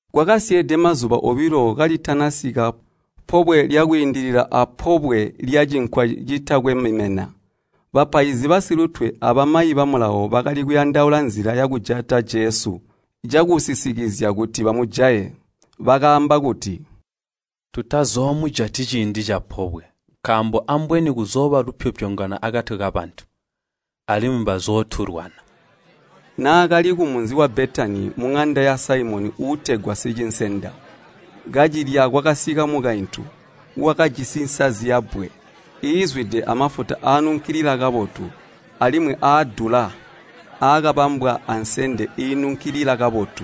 Kwakasyeede mazuba obilo kalitanasika Pobwe lya Kwiindilila apobwe lya Cinkwa Citakwe Mimena. Bapaizi basilutwe abamayi ba Mulawo bakali kuyandaula nzila yakujata Jesu cakusisikizya kuti bamujaye. Bakaamba kuti, “Tutazoomujati ciindi capobwe, nkaambo ambweni kuzooba lupyopyongano akati kabantu, alimwi bazootulwana.” Naakali kumunzi wa Betani muŋanda ya Saimoni uutegwa sicinsenda, kacilya kwakasika mukaintu, wakajisi nsazi yabbwe, iizwide amafuta aanunkilila kabotu, alimwi aadula, aakabambwa ansende iinunkilila kabotu.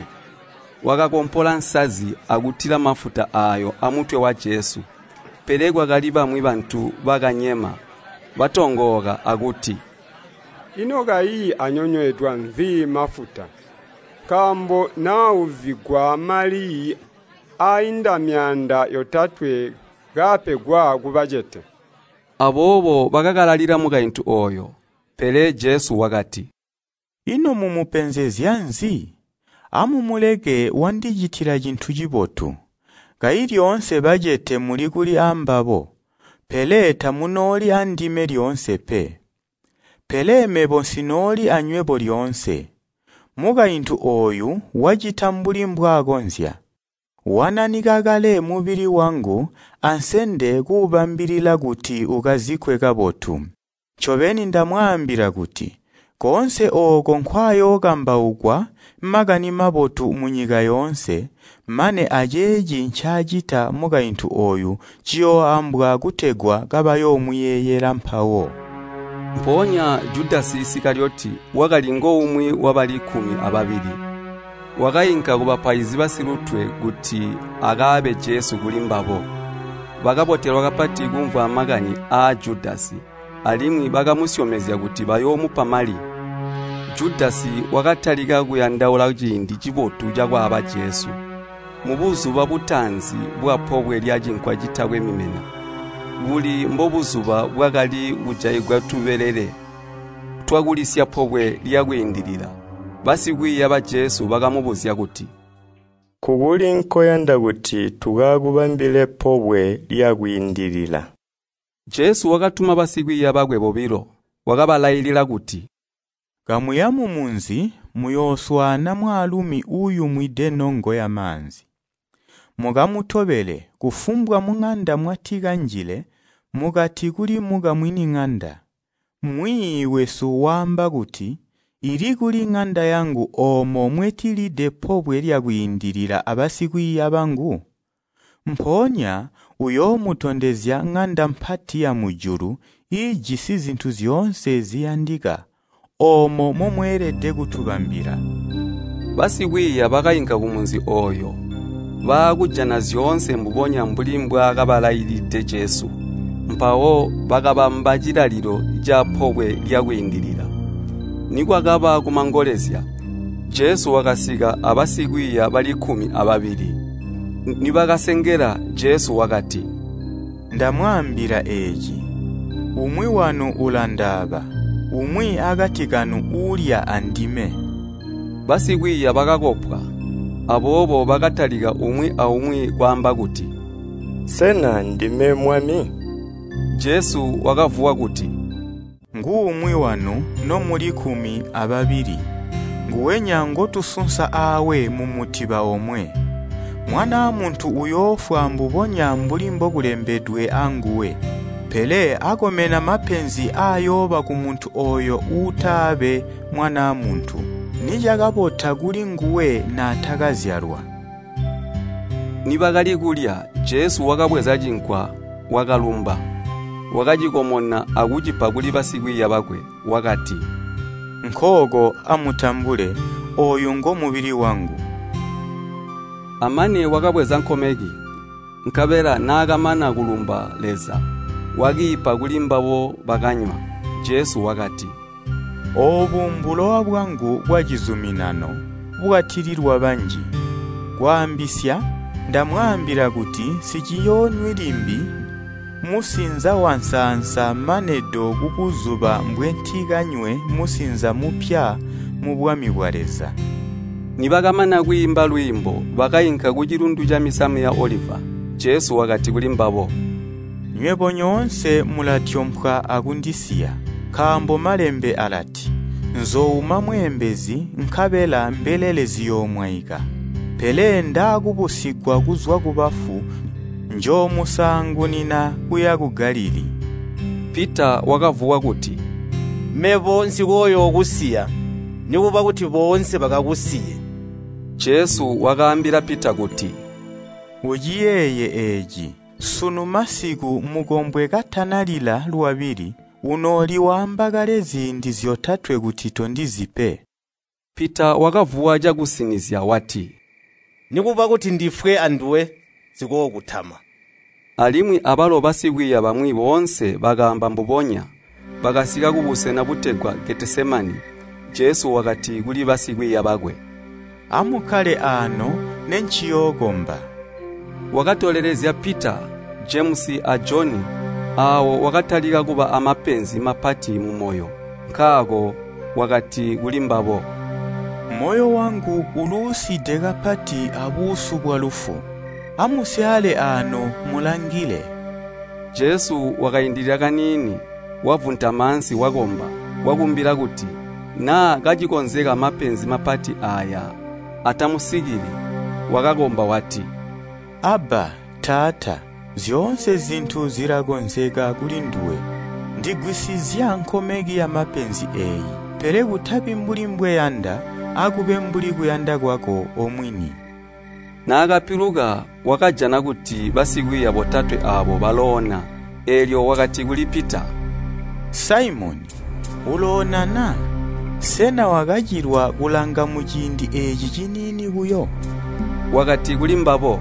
Wakakompola nsazi akutila mafuta aayo aamutwe wa Jesu. Pele kwakali bamwi bantu bakanyema, batongooka akuti, “Ino kayi anyonyweedwa nzi mafuta? Nkaambo naauzigwa amali aainda myaanda yotatwe kaapegwa kubacete.” Aboobo bakakalalila mukaintu ooyo. Pele Jesu wakati, “Ino mumupenzezya nzi? Amumuleke wandicitila cintu cibotu. Kayi lyoonse bacete muli kuli ambabo, pele tamunooli andime lyoonse pe. Pele mebo nsinooli anywebo lyoonse. Mukaintu ooyu wacita mbuli mbwakonzya, wananika kale mubili wangu ansende kuubambilila kuti ukazikkwe kabotu. Ncobeni ndamwaambila kuti koonse ooko nkwaayookambaukwa Makani Mabotu munyika yoonse, mane aceeci ncaacita mukaintu ooyu ciyooambwa kutegwa kabayoomuyeeyela mpawo.” Mpoonya Judasi Isikaliyoti, wakali ngoumwi wabali kkumi ababili, wakainka kubapaizi basilutwe kuti akaabe Jesu kulimbabo. Bakabotelwa kapati kumvwa makani aa Judasi, alimwi bakamusyomezya kuti bayoomupa mali. Judasi wakatalika kuyandaula ciindi cibotu cakwaaba Jesu. Mubuzuba butaanzi bwapobwe lya Cinkwa Citakwe Mimena, buli mbobuzuba bwakali kujaigwa tubelele twakulisya Pobwe lya Kwiindilila, basikwiiya ba Jesu bakamubuzya kuti, “Nkukuli nkoyanda kuti tukakubambile Pobwe lya Kwiindilila?” Jesu wakatuma basikwiiya bakwe bobilo, wakabalailila kuti, “Kamuya mumunzi, muyooswaana mwaalumi uuyumwide nongo yamaanzi. Mukamutobele, kufumbwa muŋanda mwati kanjile mukati kuli mukamwini ŋanda, ‘Mwiiyi wesu waamba kuti, ili kuli ŋanda yangu oomo mwetilide Pobwe lya Kwiindilila abasikwiiya bangu?’ Mpoonya uyoomutondezya ŋanda mpati yamujulu iijisi zintu zyoonse ziyandika, oomo momweelede kutubambila.” Basikwiiya bakainka kumunzi ooyo, baakujana zyoonse mbubonya mbuli mbwaakaambilide Jesu, mpawo bakabamba cilalilo ca Pobwe lya Kwiindilila. Nikwakaba kumangolezya, Jesu wakasika abasikwiiya bali kkumi ababili. Nibakasengela, Jesu wakati, “Ndamwaambila eeci, umwi wanu ulandaaba, umwi akati kanu uulya andime.” Basikwiiya bakakopwa, aboobo bakatalika umwi aumwi kwaamba kuti, “Sena ndime, Mwami?” Jesu wakavuwa kuti, “Nguumwi wanu nomuli kkumi ababili, nguwenya ngotusunsa aawe mumutiba omwe. Mwanaa Muntu uyoofwa mbubonya mbuli mbokulembedwe anguwe. Pele akomena mapenzi aayooba kumuntu ooyo uutaabe Mwanaa Muntu! Nicakabota kuli nguwe naatakazyalwa!” Nibakali kulya, Jesu wakabweza cinkwa, wakalumba, wakacikomona akucipa kuli basikwiiya bakwe. Wakati, “Nkooko amutambule. Ooyu ngomubili wangu.” Amane wakabweza nkomeki, nkabela naakamana kulumba Leza, wakiipa kuli mbabo bakanywa, Jesu wakati, “Oobu mbulowa bwangu bwacizuminano, bwatililwa banji. Kwaambisya, ndamwaambila kuti nsiciyoonywi limbi musinza wansaansa mane do kubuzuba mbwentikanywe musinza mupya mubwami bwa Leza.” Nibakamana kwiimba lwiimbo, bakainka kucilundu camisamu ya Oliva. Jesu wakati kulimbabo, “Nywebo nyoonse mulatyompwa akundisiya, nkaambo malembe alati, ‘Nzoouma mweembezi nkabela mbelele ziyoomwaika.’ Pele ndaakubusigwa kuzwa kubafu njoomusaangunina kuya ku Galilii.” Pita wakavuwa kuti, “Mebo nsikooyookusiya, nikuba kuti boonse bakakusiye.” Jesu wakaambila Pita kuti, “Uciyeeye eeci. Sunu masiku mukombwe katanalila lwabili, unooli waamba kale ziindi zyotatwe kuti tondizi pe.” Pita wakavuwa cakusinizya wati, “Nikuba kuti ndifwe anduwe nsikookutama.” Alimwi abalo basikwiiya bamwi boonse bakaamba mbubonya. Bakasika kubusena butegwa Getesemani, Jesu wakati kuli basikwiiya bakwe, “Amukkale aano, nenciyookomba.” Wakatolelezya Pita, Jemusi a Joni, aawo wakatalika kuba aamapenzi mapati mumoyo. Nkaako wakati kulimbabo, “Moyo wangu uluuside kapati abuusu bwalufu. Amusyaale aano, mulangile.” Jesu wakaindilila kaniini, wavuntama ansi wakomba, wakumbila kuti, naa kacikonzeka mapenzi mapati aaya atamusikili. Wakakomba wati, “Abba. Taata! Zyoonse zintu zilakonzeka kulinduwe. Ndigwisizya nkomeki yamapenzi eeyi. Pele kutabi mbuli mbweyanda, akube mbuli kuyanda kwako omwini.” Naakapiluka, wakajana kuti basikwiiya botatwe aabo baloona, eelyo wakati kuli Pita, “Saimoni, uloona na? Sena wakacilwa kulanga muciindi eeci ciniini buyo?” Wakati kulimbabo,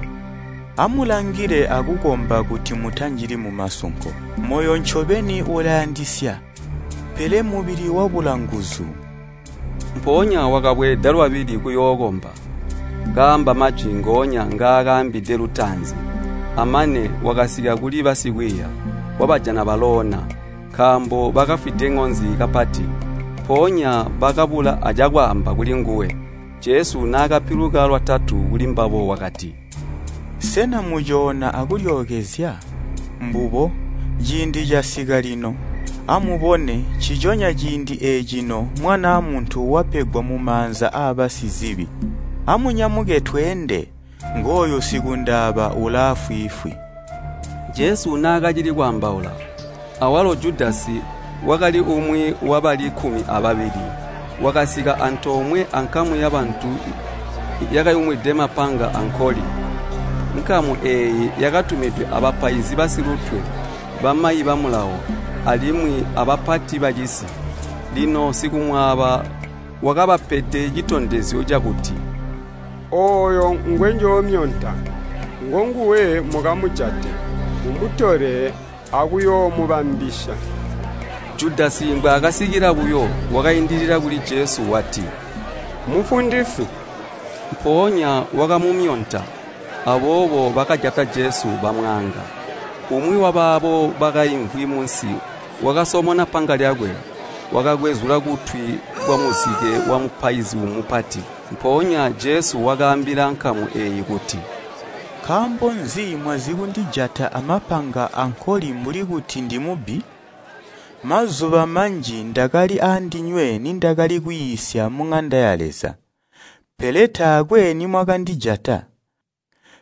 “Amulangile akukomba kuti mutanjili mumasunko. Moyo ncobeni ulayandisya pele mubili wabula nguzu.” Mpoonya wakabweeda lwabili kuyookomba, kaamba majwi ngoonya ngaakaambide lutaanzi. Amane, wakasika kuli basikwiiya, wabajana baloona, nkaambo bakafwide ŋonzi kapati. Mpoonya bakabula acakwaamba kulinguwe. Jesu naakapiluka lwatatu kulimbabo wakati, “Sena mucoona akulyookezya? Mbubo! Ciindi casika lino! Amubone, nciconya ciindi eecino Mwanaa Muntu wapegwa mumaanza aabasizibi. Amunyamuke, tweende! Ngooyu sikundaaba ulaafwiifwi.” Jesu naakacili kwaambaula, awalo Judasi, wakali umwi wabali kkumi ababili, wakasika antoomwe ankamu yabantu yakayumwide mapanga ankoli. Nkamu eeyi yakatumidwe aabapaizi basilutwe, bamayi ba Mulawo, alimwi abapati bacisi. Lino sikumwaaba wakabapede citondezyo cakuti, “Ooyo ngwenjoomyonta, ngonguwe mukamujate. Mumutole, akuyoomubambisya.” Judasi mbwaakasikila buyo, wakaindilila kuli Jesu wati, “Mufundisi.” Mpoonya wakamumyonta. Aboobo bakajata Jesu, bamwaanga. Umwi wabaabo bakaimvwi munsi wakasomona panga lyakwe, wakakwezula kutwi kwamuzike wamupaizi mupati. Mpoonya Jesu wakaambila nkamu eeyi kuti, “Nkaambi nzi mwazikundijata amapanga ankoli mbuli kuti ndimubbi? Mazuba manji ndakali andinywe nindakali kwiisya muŋanda ya Leza, pele taakwe nimwakandijata.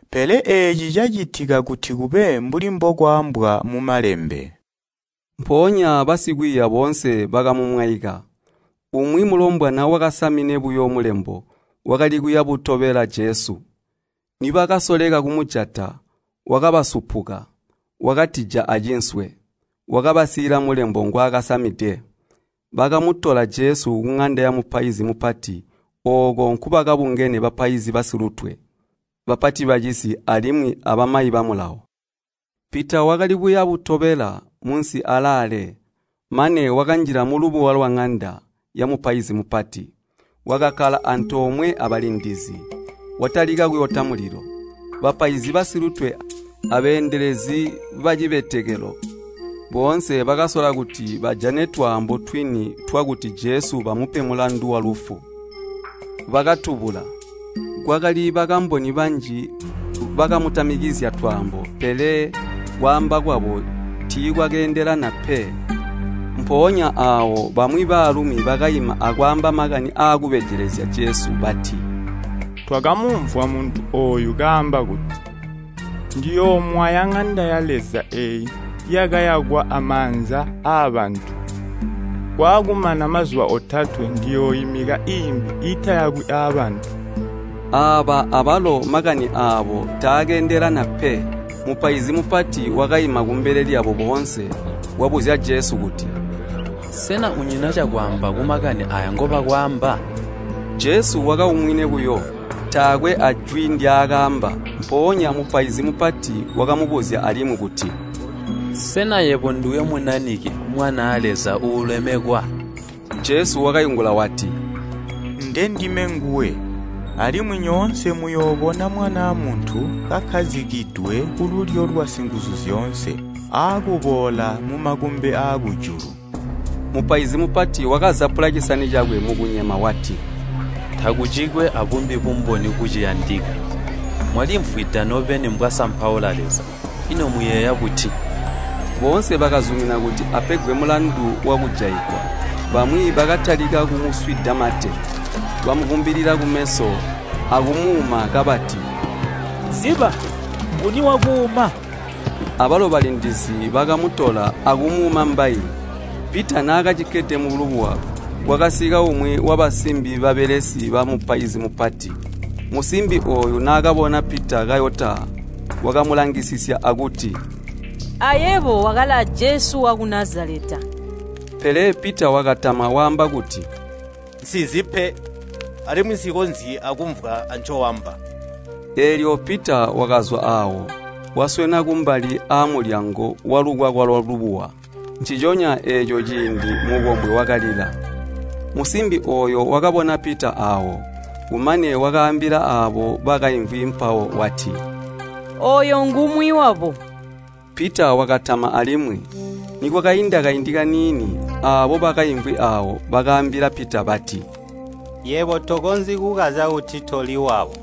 Pele eeci cacitika kut ikube mbuli mbokwaambwa mu Malembe.” Mpoonya basikwiiya boonse bakamumwaika. Umwi mulombwana wakasamine buyo mulembo, wakali kuya butobela Jesu. Nibakasoleka kumujata, wakabasupuka, wakatija acinswe, wabasiila mulembo ngwaakasamide. Bakamutola Jesu kuŋanda yamupaizi mupati, ooko nkubakabungene bapaizi basilutwe, bapati bacisi, alimwi abamayi ba Mulawo. Pita wakali kuya butobela munsi alaale, mane wakanjila mulubuwa lwaŋanda yamupaizi mupati. Wakakkala antoomwe abalindizi, watalika kuyota mulilo. Bapaizi basilutwe abeendelezi bacibetekelo boonse bakasola kuti bajane twaambo twini twakuti Jesu bamupe mulandu walufu, Jesu, bakatubula. Kwakali bakamboni banji bakamutamikizya twaambo, pele kwaamba kwabo tiikwakeendelana pe. Mpoonya aawo bamwi baalumi bakaima akwaamba makani aakubejelezya Jesu bati, “Twakamumvwa muntu ooyu kaamba kuti, ‘Ndiyoomwaya ŋanda ya Leza eeyi yakayakwa aamanza aabantu, kwaakumana mazuba otatwe ndiyooimika iimbi iitayakwi aabantu.’” Aaba abalo makani aabo taakeendelana pe. Mupaizi mupati wakaima kumbele lyabo boonse, wabuzya Jesu kuti, “Sena unyina cakwaamba kumakani aaya ngobakwaamba?” Jesu wakaumwine buyo, taakwe ajwi ndyaakaamba. Mpoonya mupaizi mupati wakamubuzya alimwi kuti, “Sena yebo nduwe Munanike, Mwanaa Leza Uulemekwa?” Jesu wakaingula wati, “Ndendime nguwe, alimwi nyoonse muyoobona Mwanaa Muntu kakkazikidwe kululyo lwa Singuzuzyoonse, akuboola mumakumbi aakujulu.” Mupaizi mupati wakazapula cisani cakwe mukunyema wati, “Takucikwe abumbi bumboni buciyandika! Mwalimvwida nobeni mbwaasampaula Leza. Ino muyeeya buti?” Boonse bakazumina kuti apegwe mulandu wakujaigwa. Bamwi bakatalika kumuswida mate, bamuvumbilila kumeso akumuuma kabati, “Ziba, nguni wakuuma?” Abalo balindizi bakamutola akumuuma mbayi. Pita naakacikkede mulubuwa, kwakasika umwi wabasimbi babelesi bamupaizi mupati. Musimbi ooyu naakabona Pita kayota wakamulangisisya akuti, “Ayebo wakali a Jesu waku Nazaleta.” Pele Pita wakatama waamba kuti, “Nsizi pe, alimwi nsikonzyi akumvwa ancoamba.” Eelyo Pita wakazwa aawo, waswena kumbali aamulyango walukwakwa lwalubuwa. Nciconya eeco ciindi mukombwe wakalila. Musimbi ooyo wakabona Pita aawo, kumane wakaambila aabo bakaimvwi mpawo wati, “Ooyo ngumwi wabo.” Pita wakatama alimwi. Nikwakainda kaindi kaniini, aabo bakaimvwi aawo bakaambila Pita bati, “Yebo tokonzyi kukazya kuti toli wabo,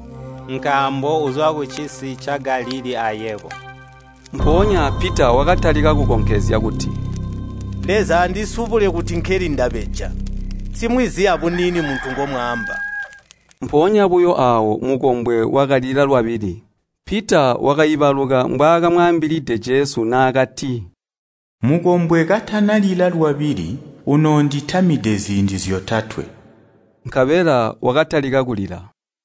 nkaambo uzwa kucisi ca Galilii ayebo.” Mpoonya Pita wakatalika kukonkezya kuti, “Leza andisubule kuti nkeli ndabeja. Nsimwizi abuniini muntu ngomwaamba.” Mpoonya buyo aawo mukombwe wakalila lwabili, Pita wakaibaluka mbwaakamwaambilide Jesu naakati, “Mukombwe katanalila lwabili unoonditamide ziindi zyotatwe.” Nkabela wakatalika kulila.